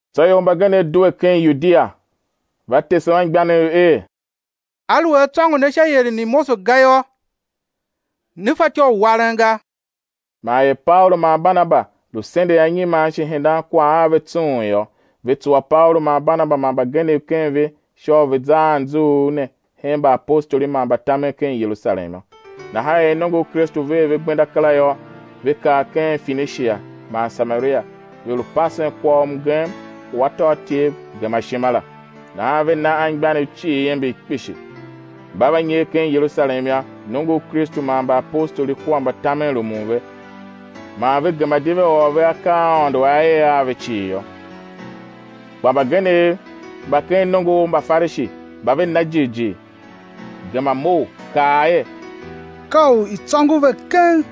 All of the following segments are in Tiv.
Tsô ior mbagenev due ken Yudia, va tese anmgbianev er: Aluer a tsôngo ne sha ieren i Mose ga yô, né fatyô u waren ga. Man er Paulu man Barnaba lu sendegh anyiman shi hendan kwagh a ve tsung yô, ve tsuwa Paulu man Barnaba man mbagenev ken ve sha u ve̱ za a anzughul ne hen mbaapostoli man mbatamen ken Yerusalem yô. Nahan er nongo u Kristu ver ve gbenda kera yô, ve kar ken Finishia man Samaria, ve lu pasen kwagh u mgem u atôatyev gema ishima la. Nahan ve na anmgbianev cii iember kpishi. Mba va nyer ken Yerusalem yô, nongo u Kristu man mbaapostoli kua mbatamen rumun ve; man ve gema di ve ôr ve akaa a Aôndo A er a ve cii yô. Kpa mbagenev mba ken nongo u Mbafarishi mba ve na jighjigh gema mough, kaa er, ka u i̱ tsôngo ve keng,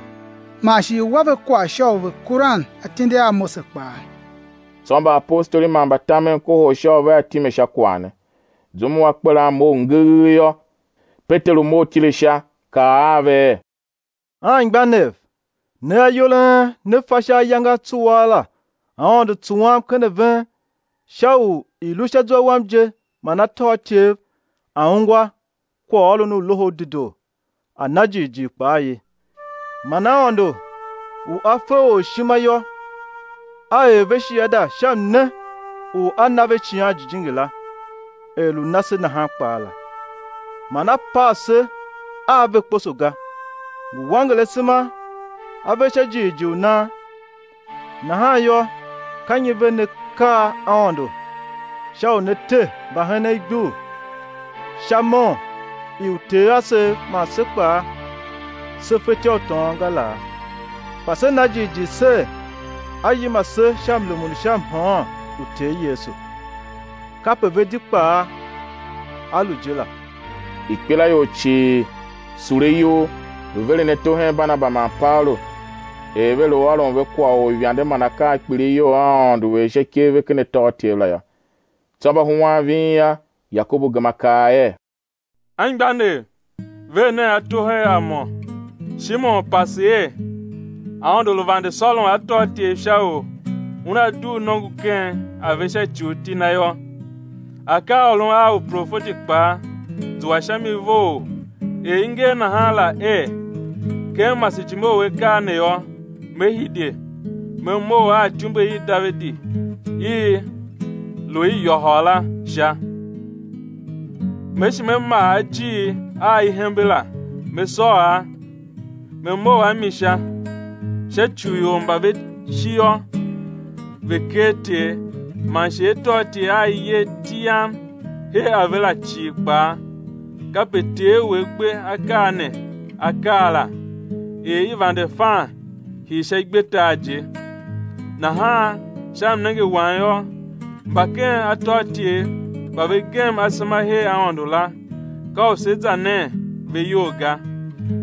man shi i̱ wa ve kwagh sha u ve kuran atindi a Mose kpaa. Tsô mbaapostoli man mbatamen kohol sha u vea time sha kwagh ne. Zum u akperan mough ngegh yô, Peteru mough tile sha, kaa a ve er: Anmgbianev, ne ayol a en ne fa sha ayange a tsuaa la Aôndo tsuwam ken a ven sha u i̱ lu sha zwa wam je man atôatyev a̱ ungwa kwaghôron u Loho u Dedoo, a̱ na Jighjigh kpaa ye. Man Aôndo u A fe or ishima yô, A er ve shiada sha mne u A na ve Icighan Jijingi la er lu na se nahan kpaa la. Man A pav se a ve kposo ga, ngu wanger asema a ve sha jighjigh u nan. Nahan yô, ka nyi ve ne kar Aôndo sha u ne te mbahenen igbur sha mon i uter asev man se kpaa se fetyô u tôôn ga laa? Kpa se na jighjigh ser, á yima se sha mrumun u sha mhôôn u Ter Yesu, kape ve di kpaa á lu je la. Ikpelaior cii sule iyol, lu veren ato hen Barnaba man Paulu er ve lu ôron ve kwagh u uivande man akaa a kpilighyol a Aôndo er sha ikev ve ken atôatyev la yô. Tsô mba huan ving yô, Yakobu gema kaa er: Anmgbianev, ver nen ato hen a mo! Shimon pase er Aôndo lu vande sôron atôatyev sha u Una dugh nongo ken a ve sha ci u iti Na yô. Akaaôron a uprofeti kpaa zua sha mi vough er i nger nahan la er: Ken masejime u akaa ne yô, Me hide, Me mough a ityumbe i Davidi i lu i yôhôl la sha; Me shi Me maa ajiir a i hembe la, Me sôr a, Me mough a mi sha, sha ci u ior mba ve shi yô, ve̱ ker Ter, man shi atôatyev a i yer iti Yam her a ve la cii kpaa; kape Ter u A gbe akaa ne A kaa la; er i vande fan hii sha igbetar je. Nahan sha mnenge wam yô, mba ken atôatyev mba ve gem asema her Aôndo la, ka u se za nen ve iyol ga,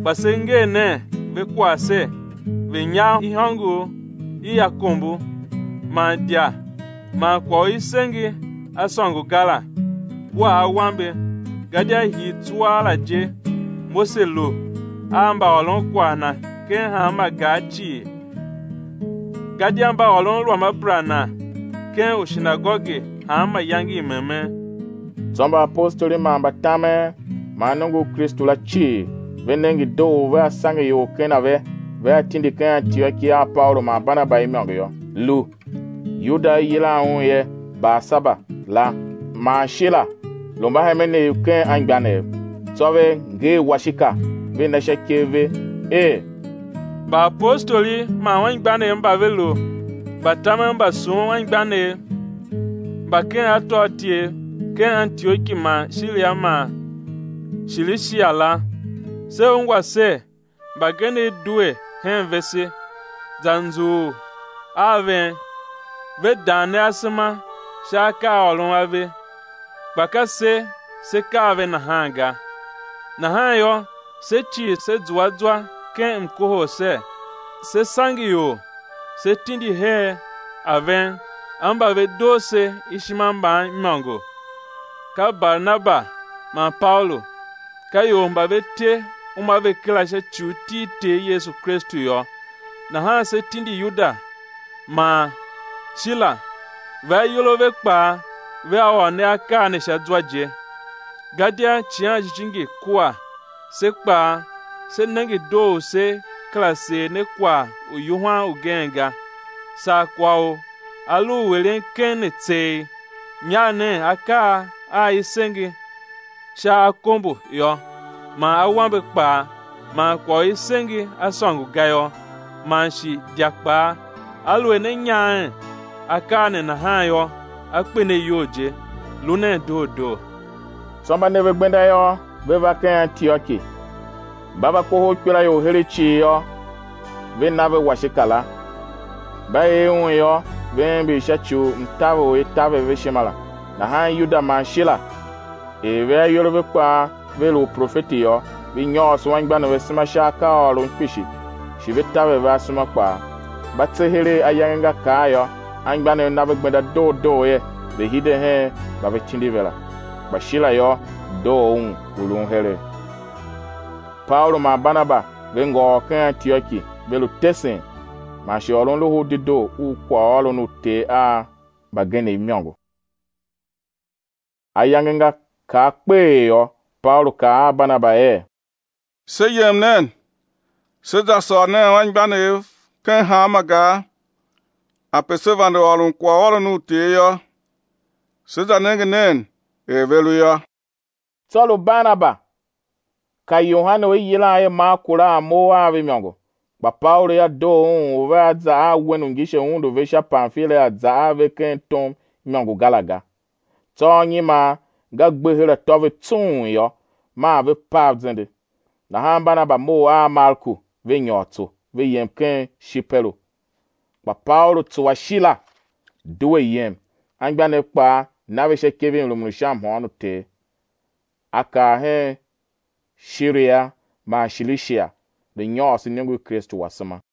kpa se nger nen ve kwagh ser, ve̱ nyagh ihôngor i akombo, man idya man kwagh u i senge a sôngo ga la, kua awambe. Gadia hii tsuaa la je, Mose lu a mbaôron kwagh na ken hanma gar cii, gadia mba ôron Ruamabera na ken ushinagoge hanma iyange i memen. Tsô mbaapostoli man mbatamen man nongo u Kristu la cii, ve nenge doo u vea sange ior ken a ve, vea tindi ken Antioki a Paulu man Barnaba imôngo yô, lu: Yuda u i yilan un er Barsaba la man Shila, lu mbahemenev ken anmgbianev. Tsô ve nger washika, ve na sha ikev ve, er: Mbaapostoli man anmgbianev mba ve lu mbatamen mba sughun anmgbianev mba ken atôatyev, ken Antioki man Shira man Shilishia la. Se ungwa ser, mbagenev due hen vese, za nzughul a ven, ve dan ne asema sha akaaôron a ve, kpa ka se se kaa ve nahan ga; nahan yô, se cii se zua zwa ken mkohol ser, sé sange ior se tindi her a ven a mba ve doo se ishima mban imôngo, ka Barnaba man Paulu. Ka ior mba ve te uma ve kera sha ci u iti i Ter Yesu Kristu yô. Nahan se tindi Yuda man Shila, ve ayol a ve kpaa vea ôr ne akaa ne sha zwa je. Gadia Icighan Jijingi kua se kpaa se nenge doo u sé kera seer ne kwagh u yuhwan ugen ga, saa kwagh u a lu u eren keng ne tseegh: Nyagh nen akaa a i senge sha akombo yô, man awambe kpaa, man kwagh u i senge a sôngo ga yô, man shi idya kpaa; aluer ne nyaghen akaa ne nahan yô, á kpe ne iyol je. Lu nen doo doo. Tsô mba ne ve gbenda yô, ve va ken Antioki. Mba va kohol ikpelaior heregh cii yô, ve na ve washika la. Mba er un yô, ve ember sha ci u mtaver u i taver ve ishima la. Nahan Yuda man Shila, er ve ayol a ve kpaa ve lu uprofeti yô, ve nyôôso anmgbianev asema sha akaaôron kpishi, shi ve taver ve asema kpaa. Mba tse heregh ayange nga kar yô, anmgbianev na ve gbenda doo doo er ve̱ hide hen mba ve tindi ve la. [ Kpa Shila yô, doo un u lun heregh]. Paulu man Barnaba ve ngôôr ken Antioki, ve lu tesen, man shi ôron Loho u Dedoo u kwaghôron u Ter a mbagenev imôngo. Ayange nga kar kpeghee yô, Paulu kaa a Barnaba er: Se yem nen, se za sôr nen anmgbianev ken hanma gar ape se vande ôron kwaghôron u Ter yô, se za nenge nen er ve lu yô. Tsô lu Barnaba ka Yohane u i yilan er Marku la a mough a ve imôngo, kpa Paulu yô, doo un u vea za a wen u ngise undu ve sha Pamfilia za a ve ken tom imôngo ga la ga. Tsô anyiman nga gbe her atô ve tsung yô, maa ve pav zende; nahan Barnaba mough a Marku, ve nyôr tso, ve yem ken Shiperu. Kpa Paulu tsuwa Shila, due yem, anmgbianev kpaa na ve sha ikev i mrumun u sha mhôôn u Ter. A kar hen Shiria man Shilishia, lu nyôôso iniongo i Kristu asema.